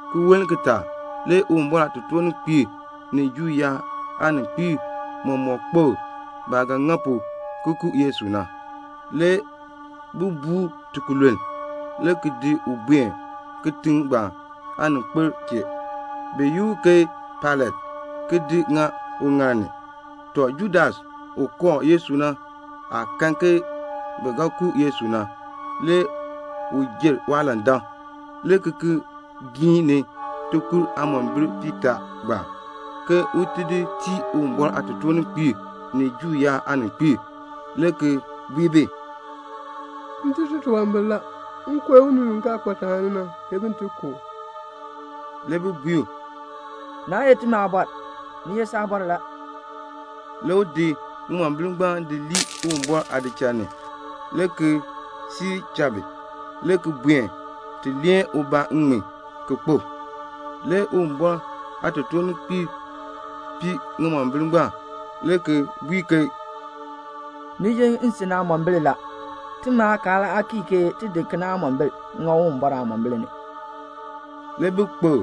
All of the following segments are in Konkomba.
Ki woln kitaak le Uwumbɔr aatotoorninkpiib ni Juu yaab aaninkpiib mɔmɔk kpokl baah ga ŋa pu ki ku Yesu na. Le bi buu u tikululn, le ki di u buen kitiŋ ngbaan aaninkpil chee, bi yi u ke Pailat, ki di ŋa uŋaal ni. Tɔ, Judas u kooh Yesu na, waah kan ke bi ga ku Yesu na, le u jer waalandak, le ki ki giin ni ŋimombil aakur piitaa ngbaan, ke un di tii Uwumbɔr aatotoorninkpiib ni Juu yaab aaninkpiib, le ki bui bi, "M tun titunwambir la. M kooh unii u kaa kpa taani na, ke bin ti ku u." Le bi bui u, "Naa ye timi aabɔr. Ni ye saabɔr la." Le u di ŋimombil ngbaan di lii Uwumbɔr aadiik ni, le ki siir cha bi, le ki buen, ki ti di ŋŋmin leen, ki ku ubaa. Le Uwumbɔr aatotoorninkpiib pii ŋimombil ngbaan, le ki bui ke "Ni ye nsin aamombil la. Timi aakaal aa kii kena, ke ti di ŋa Uwumbɔr aamombil ni." Le bi kpokl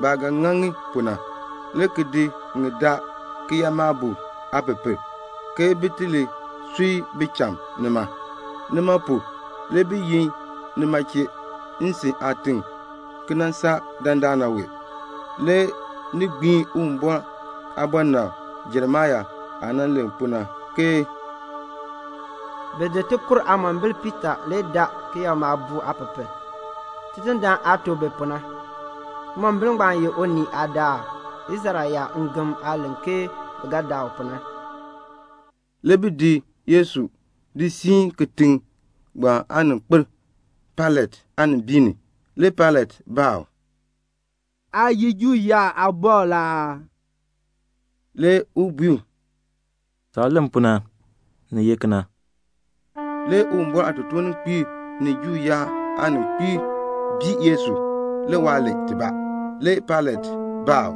baah ga ŋa ŋi pu na, le ki daa kiyakmaabuuk aapepel, ke bin ti li sui bicham nima. Nima pu na le bi yi nima chee, "Nsin aatiŋ" ki nan saa dandana wee. Le ni gbiin Uwumbɔr aabɔnabr Jeremia aah nan len pu na, ke "Bi di ŋimombil aakur piitaa le ki daa kiyakmaabuuk aapepel, Tidindaan aah tuk bi pu na. Ŋimombil ngbaan ye unii aadaak, Israel yaab ngem aah len ke bi ga daa u pu na." Le bi di Yesu ki di siin kitiŋ ngbaan aaninkpil Pailat aanimbiin ni. Le Pailat baa u, "Aa ye Juu yaab aabɔr la aa?" Le u bui u, "Saah len pu na, ni ye kena." Le Uwumbɔr aatotoorninkpiib ni Juu yaab aaninkpiib bii Yesu. Le waa len tibaa. Le Pailat baa u,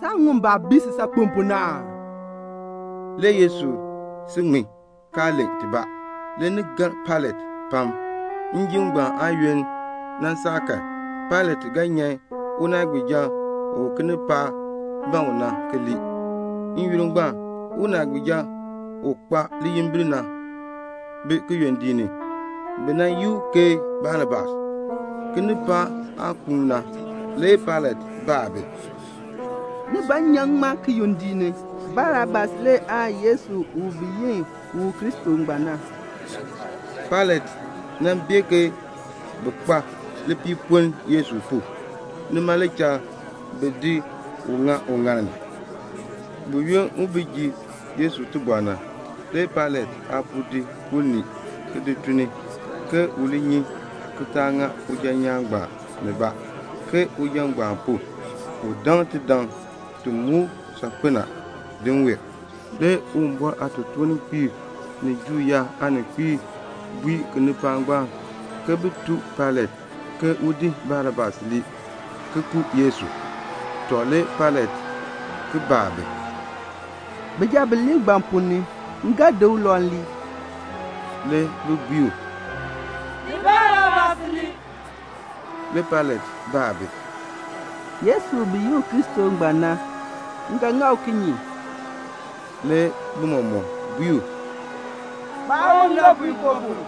"Saa ŋun baah bii si saakpen pu na aa?" Le Yesu si ŋmin, kaa len tibaa. Le ni gar Pailat pam. Njim ngbaan aayoonn nan saa kan, Pailat ga nyan unaagbiija u kinipaak na ban u na, ki lii. N-yoonn ngbaan unaagbiija u kpa liyimbil na, bi kiyondiik ni. Bi yi u ke Barabas. Kinipaak aah kuun na, le Pailat baa bi, "Ni ban m nyan ŋmaa kiyondiik ni? Barabas le aan Yesu u bi yi u Kristo ngbaan na?" Pailat bee ke bi kpa lipiipoln Yesu pu, nima le cha bi di u ki di ŋa uŋaal ni. Buyoonn waah bi ji Yesu aabɔr na, le Pailat aapuu di unii ki di tun ni, ke u li nyi ki taa ŋa uja nyaan ngbaan nibaa; ke uja ngbaan pu, u daŋ tidaŋ ti muk u saakpen na din wee. Le Uwumbɔr aatotoorninkpiib ni Juu yaab aaninkpiib bui kinipaak ngbaan ke bin tuk Pailat ke un di Barabas lii, ki ku Yesu. Tɔ, le Pailat ki baa bi, "Bijab bilee ngbaan ponn ni, m ga di ulau lii?" Le bi bui u, "Di Barabas lii." Le Pailat baa bi, "Yesu u bi yi u Kristo ngbaan na, m ga ŋa u kinye?" Le bi mɔmɔk bui u, "Kpaa u ndɔpuinkoo pu."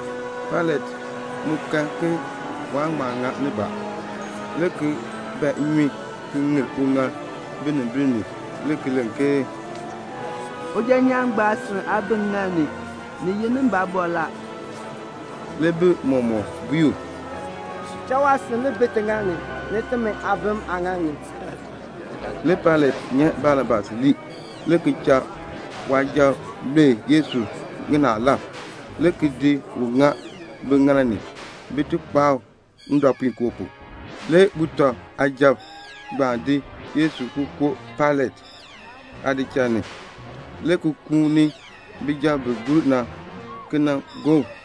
Pailat mu kan ke waan ŋma ŋa nibaa, le ki ban nnyun, ki ŋir uŋaal binimbil ni, ki len ke, "Uja nyaan ngbaan aasin aa bi ŋŋaal ni. Ni ye nimi aabɔr la." Le bi mɔmɔk bui u, "Cha waasin li bi tiŋaal ni, ni timi aabim aaŋaal ni." Le Pailat nyan Barabas lii, le ki cha waasujatiib lue Yesu ŋinaalab, le ki di u ŋa biŋaal ni, bin ti kpaa u ndɔpuinkoo pu. Le sujatiib ngbaan di Yesu ki di koo Pailat aadichal ni, le ki kuuni sujatiib bi gur na ki nan gob u.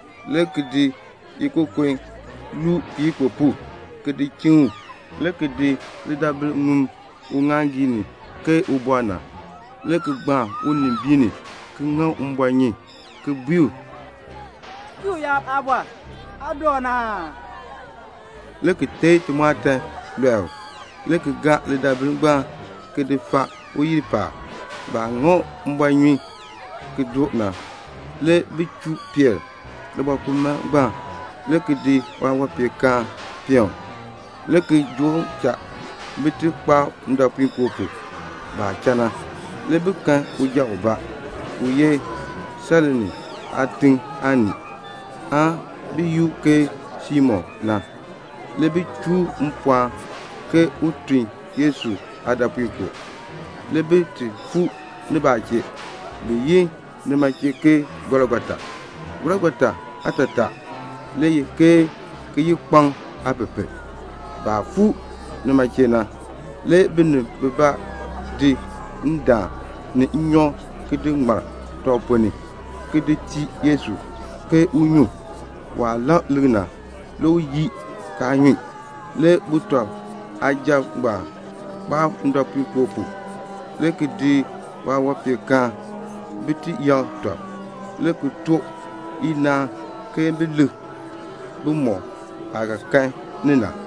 le ki di ikokon ki luu kiyikpupuk, le ki di chiŋ u, le ki di lidaabil, ki di ŋum uŋaaŋgii ni ke ubɔr na, le ki gbaan unimbiin ni, ki ŋa u mbɔɔnyun, le ki bui u, "Juu yaab Aabɔr, aa doon aa?" le ki teei timɔɔtan ki lɔe u, le ki gaa lidaabil ngbaan ki di faa uyil paab. Baah ŋa u mbɔɔnyun ki ti doo na, le bi chuu peer libɔkumaln ngbaan, le ki di waawanpeenkaan di peen u, le ki joo u cha, bin ti kpaa u ndɔpuinkoo pu. Baah cha na, le bi kan uja ubaa, u ye Sairene aatiŋ aanii, bi yi u ke Simon. Le bi chuu u mpɔɔn un tun Yesu aadɔpuinkoo. Le bi fuu nibaa chee. Bi yi nima chee ke Golgota. Golgota aatataa le ye ke "Kiyikpaŋ aapepel." Baah fuu nima chee na, le binib bibaa di ndaan ni nnyɔk ki di ŋmar tɔb ponn ni, ki di tii Yesu, ke un nyun. Le waah lak lik na, le u yii, kaa nyun. Le sujatiib ngbaan kpaa u ndɔpuinkoo pu, le ki di waawanpeenkaan bin ti yakr tɔb, le ki too chacha ke bin lik bimɔk aah ga kan ni na,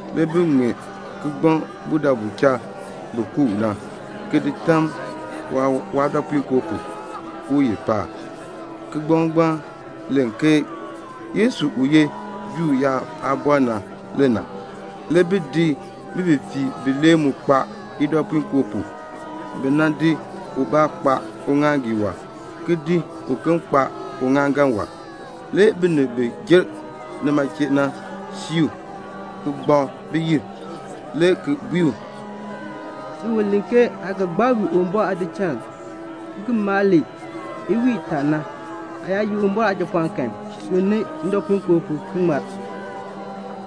Le bi di kigbaŋ ki ŋmee budabu cha bi ku u na, le ki di tam waadɔpuinkoo pu uyil paab. Kigbaŋ ngbaan len ke, "Yesu u ye Juu yaab Aabɔr na le na." Le bi di bififiirb bilee ki di kpaa idɔpuinkoo pu. Bi di ubaa kpaa uŋaaŋgii wɔb, ki di uken kpaa uŋaaŋgan wɔb. Le binib bi jer nima chee na sii u, ki gbakr biyil, le ki bui u, "Si u len ke aa ga gbaa wii Uwumbɔr aadiik ki ki maa ki iwiin itaa na, aa yaa ye Uwumbɔr Aajapɔɔn kan, sunn ni ndɔpuinkoo pu, ki ŋmar."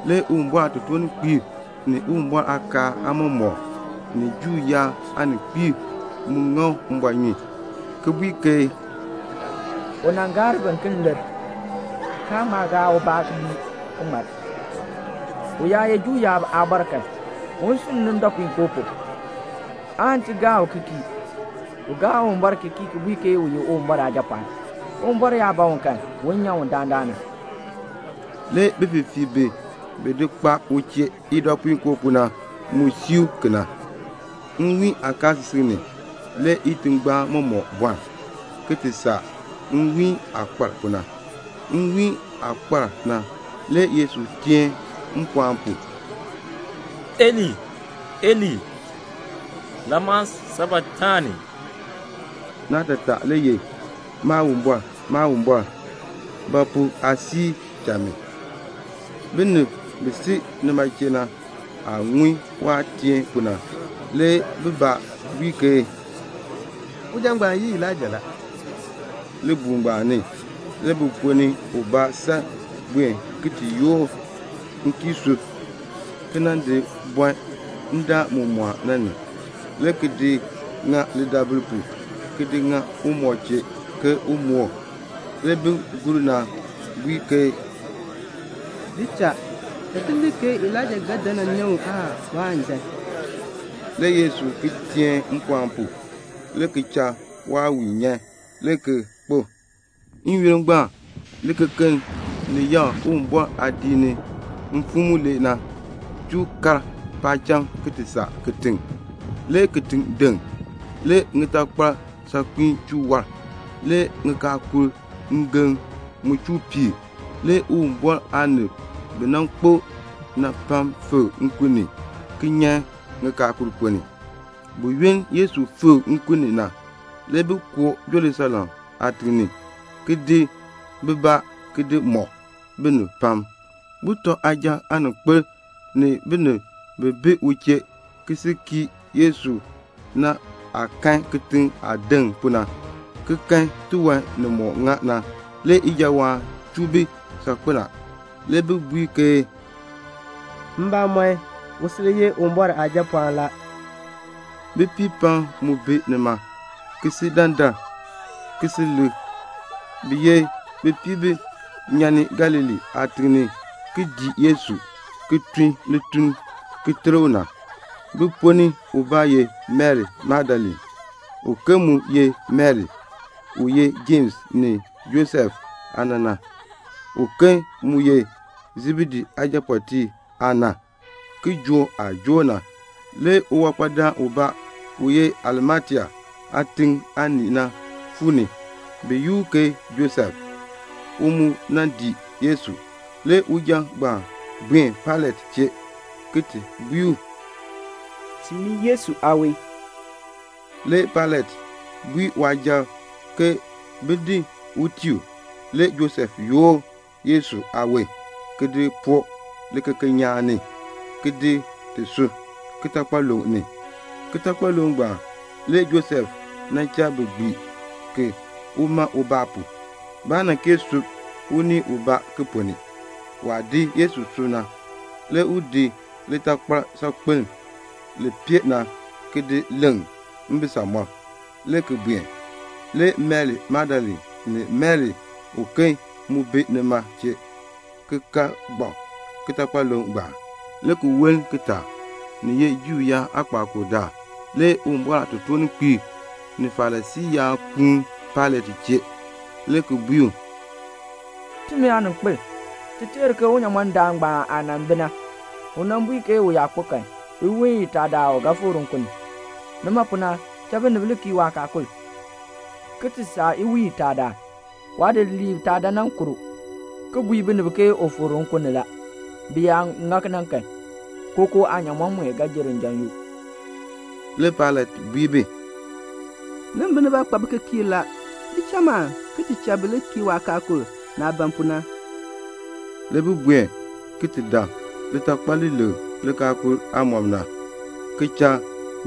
Le Uwumbɔr aatotoorninkpiib ni Uwumbɔr aakaal aamɔmɔkb ni Juu yaab aaninkpiib mu ŋa u mbɔɔnyun, ki bui ke, "U nan gaar biken le bi ŋmar, kaan ŋma gaa ubaa ki ŋmar. U yaa ye Juu yaab Aabɔr kan, un sunn ni ndɔpuinkoo pu, le ti gaa u ki kii. U gaa Uwumbɔr ki kii, ki bui ke u ye Uwumbɔr Aajapɔɔn. Uwumbɔr yaa ban u kan, un nyan u dandana." Le bififiirb bi bi di kpaa u chee idɔpuinkoo pu na, bi mu sii u kena la. Nwiin kaasisik ni le itingbaan mɔmɔk bɔln, ki ti saa nwiin aah kpar pu na. Nwiin aah kpar na, le Yesu teen mpɔɔn pu, "Eli, Eli, lama sabaktani." Naatataa le ye, "Maawumbɔr, Maawumbɔr, ba pu aa di cha mi?" Binib bi si nima chee na aah ŋun waah teen pu na, le bibaa bui ke, "Uja ngbaan yi Elaija la." Libuul ngbaan ni le bi ponn ni ubaa san buen ki ti yoor nkiisuu, ki nan di bɔn ndaan mu mɔɔn na ni, le ki di ŋa lidaabil pu, le ki di ŋa umɔb chee ke un moor. Le bin gur na bui ke "Di cha. Ti lik ke Elaija ga dan nan nyan u aan waan dan." Le Yesu ki teen mpɔɔn pu, le ki cha waawiin nyan, le ki kpo. N-yoonn ngbaan le likekeln li yakr Uwumbɔr aadiik ni mfim mulee na, chuu kar paacham ki ti saa kitiŋ. Le kitiŋ deŋ. Le ŋitakpal saakpiin chuu waar. Le ŋikaakul ngem mu chuu piir. Le Uwumbɔr aanib bi nan kpo na pam fikr nkun ni, ki nyan ŋikaakul ponn ni. Buyoonn Yesu fikr nkun ni na, le bi koo Jerusalem aatiŋ ni, le ki di bibaa ki di mɔk binib pam. Sujatiib aaninkpil ni binib bi bi u chee ki kii Yesu na, baah kan kitiŋ aah deŋ pu na, ki kan tiwan nimɔk ŋa na, le ijawaan chuu bi saakpen a. Le bi bui ke "Mbamɔn, u sil ye Uwumbɔr Aajapɔɔn la." Bipiib pam mu bi nima, ki si dandar, ki si lik. Bi ye bipiib bi nyan ni Galilee aatiŋ ki dii Yesu na, ki tun lituln ki ter u na. Bi ponn ni ubaa ye Mari Magdalene; uken mu ye Mari, u ye Jems ni Josef aana na; uken mu ye Sebedee aajapɔɔtiib aana. Kijook aah joor na, le uwankpadaan ubaa, u ye Arimatea aatiŋ aanii na fuu ni. Bi yi u ke Josef. U mu dii Yesu. Le uja ngbaan buen Pailat chee le ki bui u, "Tiin mi Yesu aawon." Le Pailat bui waasujatiib ke bin di tii u. Le Josef yoor Yesu aawon, ki di poo likekeln nyaan ni, ki di ti sub kitakpaluŋ ni. Kitakpaluŋ ngbaan le Josef nan cha bi gbii ki, ki tii uma ubaa la. Baa nan kee sub unii ubaa ki ponn ni. Waah di Yesu ki di sub na, le u di litakpal saakpeln li pee na, ki di leŋ mbisamɔb, le ki buen. Le Mari Magdalene ni Mari uken mu bi nima chee, ki ka gbak kitakpaluŋ ngbaan. Le ki woln kitaak, ni ye Juu yaab aakpakool daal, le Uwumbɔr aatotoorninkpiib ni Farisii yaab kuun Pailat chee, le ki bui u, "Timi aaninkpil, ti teer ke unyamɔndaan ngbaan aah nan bi na, u nan bui ke u yaa kpo kan, iwiin itaadaal u ga fikr nkun ni. Nima pu na, cha binib li kii waakaakul, ki ti saa iwiin itaa daal, waadidiliib taa dan nan kur u, ki bui binib ke u fikr nkun ni la. Bi yaa ŋa kena kan, kookoo aanyaamɔn mue ga jer njan yoo." Le Pailat bui bi, "Nimi nibaa kpa bikikiirb la. Li cha man, ki cha bi li kii waakaakul, naah ban pu na." Le bi buen ki ti dab litakpal li leŋ likaakul aamɔb na, ki cha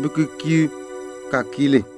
bikikiirb ka kii li.